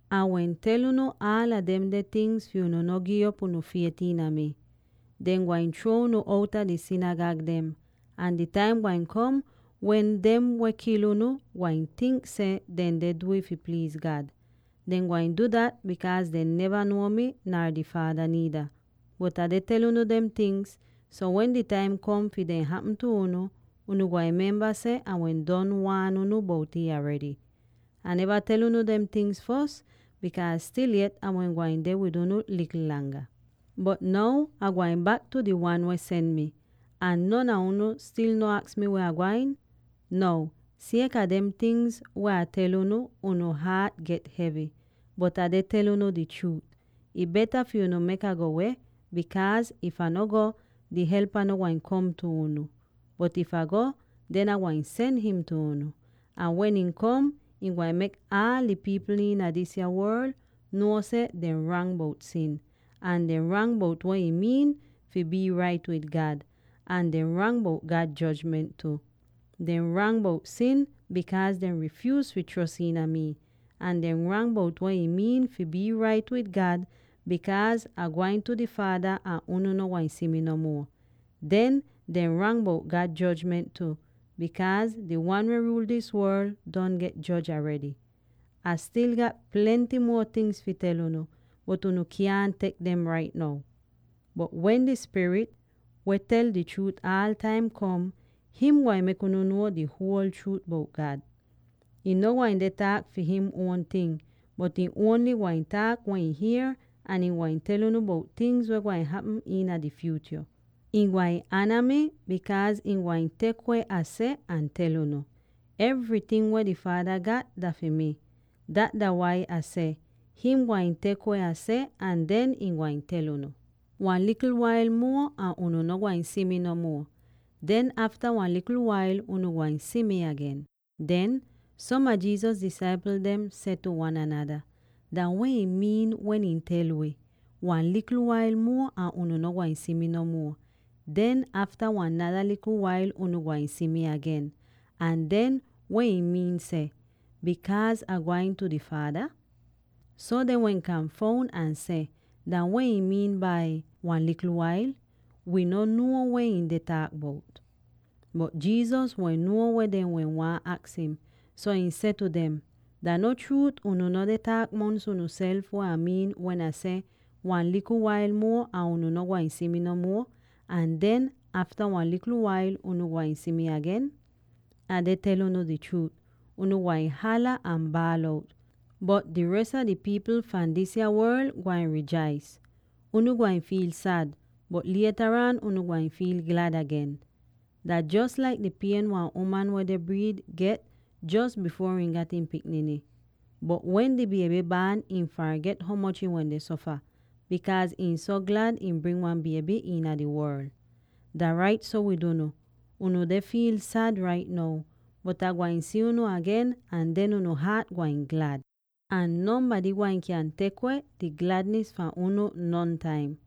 “Ah wehn tel unu aala demde tingz fi unu no gi'op unu fiet iina mi. Dehn gwain chruo unu outa di sinigag dem, ahn di taim gwain kom wen dem weh kil unu gwain tink seh dehn deh du'ih fi pliiz God. Dehn gwain du dat bikaaz dehn neva nuo mii nar di Faada niida. Bot Ah deh tel unu dem tingz so wen di taim kom fi dem hapm tu unu, unu gwain memba seh Ah wehn don waan unu bout'ih aredy. Ah neva tel unu dem tingz fos, bikaaz stil yet Ah wehn gwain deh wid unu likl langa. “Bot now Ah gwain bak tu di Wan weh sen mi, ahn non a unu stil no aks mi weh Ah gwain? Now sieka dem tingz weh Ah tel unu, unu haat get hevy. Bot Ah deh tel unu di chruut: ih beta fi unu mek Ah go weh, bikaaz if Ah no go, di Helpa no gwain kom tu unu; bot if Ah go, den Ah gwain sen him tu unu. Ahn wen ihn kom, ihn gwain mek aal di pipl iina disa worl nuo seh dehn rang bout sin, ahn dehn rang bout weh ih miin fi bii rait wid God, ahn dehn rang bout God jojment tu. Dehn rang bout sin, bikaaz dehn rifyuuz fi chros iina mii. Ahn dehn rang bout weh ih miin fi bii rait wid God, bikaaz Ah gwain tu di Faada ahn unu no gwain si mi no muo. Den, dehn rang bout God jojment tu, bikaaz di wan weh ruul dis worl don get joj aredy. “Ah stil gat plenty muo tingz fi tel unu, bot unu kyaahn tek dem rait now. Bot wen di Spirit —weh tel di chruut aal taim— kom, him gwain mek unu nuo di huol chruut bout God. Ihn no gwain deh taak fi him uon ting, bot ihn ongl gwain taak weh ihn hier, ahn ihn gwain tel unu bout tingz weh gwain hapm iina di fyutyo. Ihn gwain ana mii, bikaaz ihn gwain tek weh Ah seh ahn tel unu. Evryting weh di Faada gat dah fi mii. Dat dah wai Ah seh: him gwain tek weh Ah seh ahn den ihn gwain tel unu. “Wan likl wail muo ahn unu no gwain si mi no muo; den afta wan nada likl wail, unu gwain si mi agen.” Den, som a Jesus disaipl dem seh tu wan anada, “Dah weh ihn miin wen him tel wi, ‘Wan likl wail muo ahn unu no gwain si mi no muo; den afta wan nada likl wail, unu gwain si mi agen;’ ahn den, weh ihn miin seh, ‘—bikaaz Ah gwain tu di Faada’?” So dehn wehn kanfoun ahn seh, “Dah weh ihn miin bai, ‘—wan likl wail’? Wii no nuo weh him deh taak bout.” Bot Jesus wehn nuo weh dehn wehn waahn aks im, so ihn seh tu dem, “Dah no chruut, unu no deh taak mongs unuself weh Ah miin wen Ah seh, ‘Wan likl wail muo ahn unu no gwain si mi no muo; ahn den afta wan nada likl wail, unu gwain si mi agen’? Ah deh tel unu di chruut: unu gwain hala ahn baal out, bot di res a di pipl fahn disa worl gwain rijais. Unu gwain fiil sad, bot lietaraan unu gwain fiil glad agen. Dah jos laik di pien wan uman weh deh briid get jos bifuor ihn gat ihn pikniny. Bot wen di bieby baan, shii farget ho moch ihn wende sofa, bikaaz ihn so glad ihn bring wan bieby iina di worl. “Dah rait so wid unu: unu deh fiil sad rait now, bot Ah gwain si unu agen ahn den unu haat gwain glad, ahn nonbady gwain kyan tek weh di gladnis fahn unu nontaim.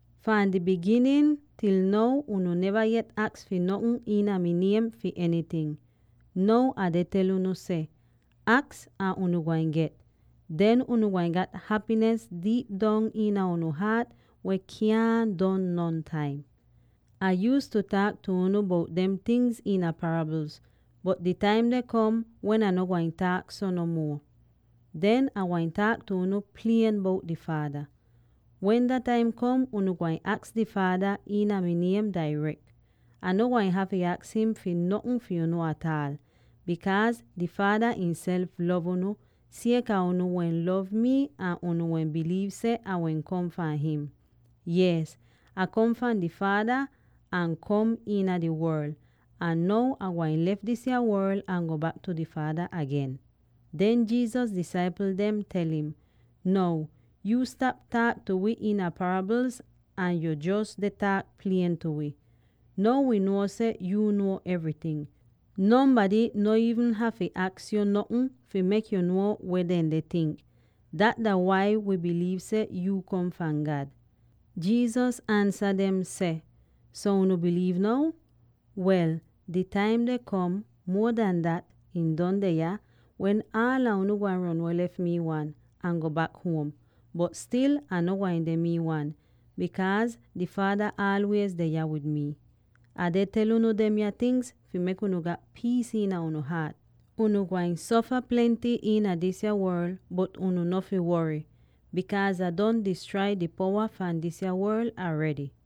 Fahn di biginin til now unu neva yet aks fi notn iin mi niem fi enyting. Now Ah deh tel unu seh: aks ahn unu gwain get. Den unu gwain gat hapinis diip dong iina unu haat weh kyaahn don nontaim. “Ah yuuztu taak tu unu bout demya tingz iina parabl, bot di taim deh kom wen Ah no gwain taak so no muo. Den Ah gwain taak tu unu klier bout di Faada. Wen dah taim kom, unu gwain aks di Faada iina mi niem dairek. Ah no gwain hafy aks him fi notn fi unu ataal; bikaaz di Faada ihnself lov unu, sieka unu wehn lov mi ahn unu wehn biliiv seh Ah wehn kom fahn him. Yees, Ah kom fahn di Faada ahn kom iina di worl; ahn now Ah gwain lef disa worl ahn go bak tu di Faada agen.” Den Jesus disaipl dem tel im, “Now, yu stap taak tu wi iina parabl ahn yo jos deh taak klier tu wi. Now wi nuo seh yu nuo evryting; nonbady no iivn hafy aks yu notn fi mek yu nuo weh dehn deh tink! Dat dah wai wii biliiv seh yu kom fahn God.” Jesus ansa dem seh, “So unu biliiv now?” Wel, di taim deh kom —muo an dat, ih don deh yah— wen aala unu gwain ron weh lef mii wan, ahn go bak huom. Bot stil Ah no gwain deh mii wan, bikaaz di Faada aalwiez deh yah wid mi. “Ah deh tel unu demya tingz fi mek unu gat piis iina unu haat. Unu gwain sofa plenty iina dis worl, bot unu no fi wory, bikaaz Ah don distrai di powa fahn dis worl aredy.”